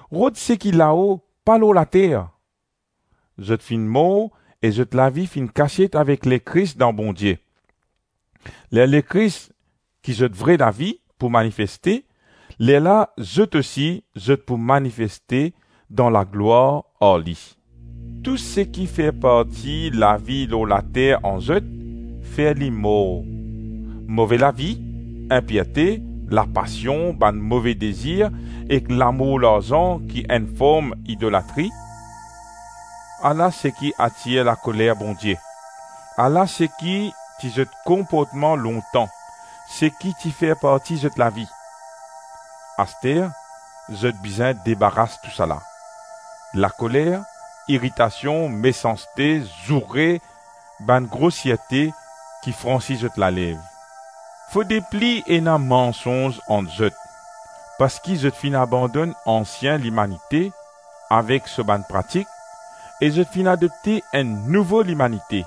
rod seki lao pa lor later. Zot finn mor e zot lavi finn kasiet avek Lekris dan Bondie. Ler Lekris, ki zot vre lavi, pou manifeste, lerla zot ousi zot pou manifeste dan laglwar ar li. Tou seki fer parti lavi lor later an zot, fer li mor: move lavi, inpirte, lapasion, bann move dezir ek lamour larzan ki enn form lidolatri. Ala seki atir lakoler Bondie, ala seki ti zot konportman lontan, seki ti fer parti zot lavi. Aster, zot bizin debaras tousala: lakoler, iritasion, mesanste, zoure, bann grosierte ki fransi zot lalev. Fode pli ena mansonz ant zot, parski zot finn abandonn “ansien limanite”, avek so bann pratik, e zot finn adopte enn “nouvo limanite”,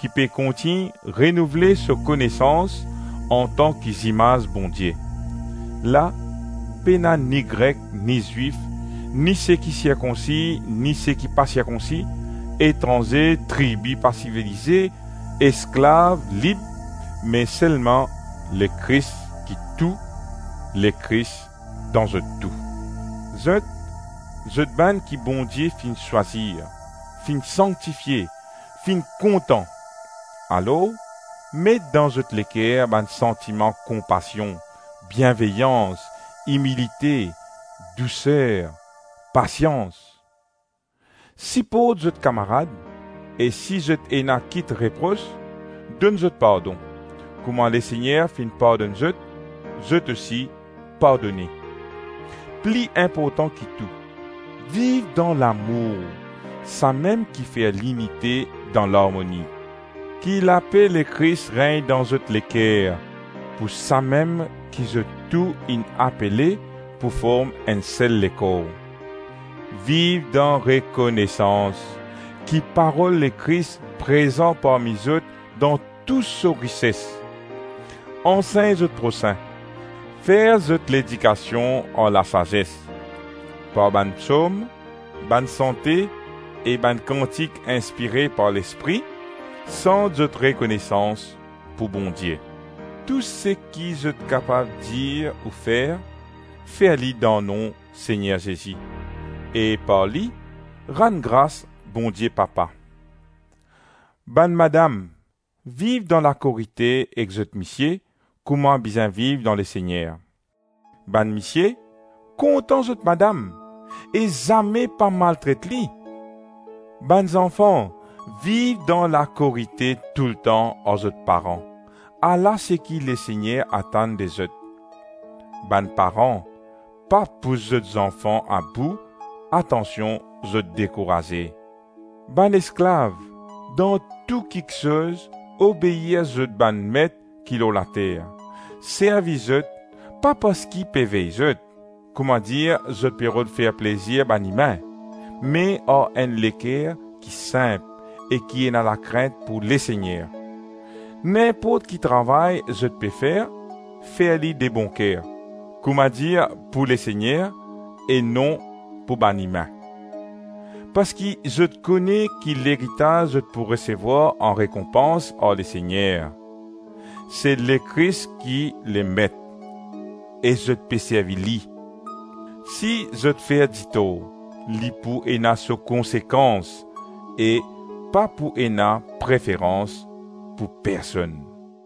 ki pe kontign renouvle so konesans antan ki zimaz Bondie; la, pena ni Grek ni Zwif, ni seki sirkonsi ni seki pa sirkonsi, etranze, tribi pa sivilize, esklav, lib, me selman Lekris ki tou, Lekris dan zot tou. Zot, zot bann ki Bondie finn swazir, finn sanktifie, finn kontan, alor met dan zot leker bann santiman konpasion, bienveyans, imilite, douser, pasians. Siport zot kamarad, e si zot ena kit repros, donn zot pardon; kouma Lesegner finn pardonn zot, zot ousi pardone. Pli inportan ki tou, viv dan lamour, samem ki fer linite dan larmoni. Ki lape Lekris regn dan zot leker, pou samem ki zot tou inn apele pou form enn sel lekor. Viv dan rekonesans. Ki parol Lekris prezan parmi zot dan tou so rises: ansegn zot prosin, fer zot ledikasion ar lasazes; par bann Psom, bann sante e bann kantik inspire par Lespri, sant zot rekonesans pou Bondie Tou seki zot kapav dir ou fer, fer li dan nom Segner Zezi, e par li, rann gras Bondie Papa. Bann madam, viv dan lakorite ek zot misie kouma bizin viv dan Lesegner. Bann misie, kontan zot madam e zame pa maltret li. Bann zanfan, viv dan lakorite toultan ar zot paran, ala seki Lesegner atann de zot. Bann paran, pa pous zot zanfan abou atansion zot dekouraze. Bann esklav, dan tou kiksoz obeir zot bann met ki lor later. Servi zot, pa parski pe vey zot, kouma dir zot pe rod fer plezir bann imin, me ar enn leker ki sinp e ki ena lakrint pou Lesegner. Ninport ki travay zot pe fer, fer li debonker, kouma dir pou Lesegner e non pou bann imin. Parski zot kone ki leritaz zot pou resevwar an rekonpans ar Lesegner. Se Lekris ki Lemet, e zot pe servi li. Si zot fer ditor, li pou ena so konsekans, e pa pou ena preferans pou person.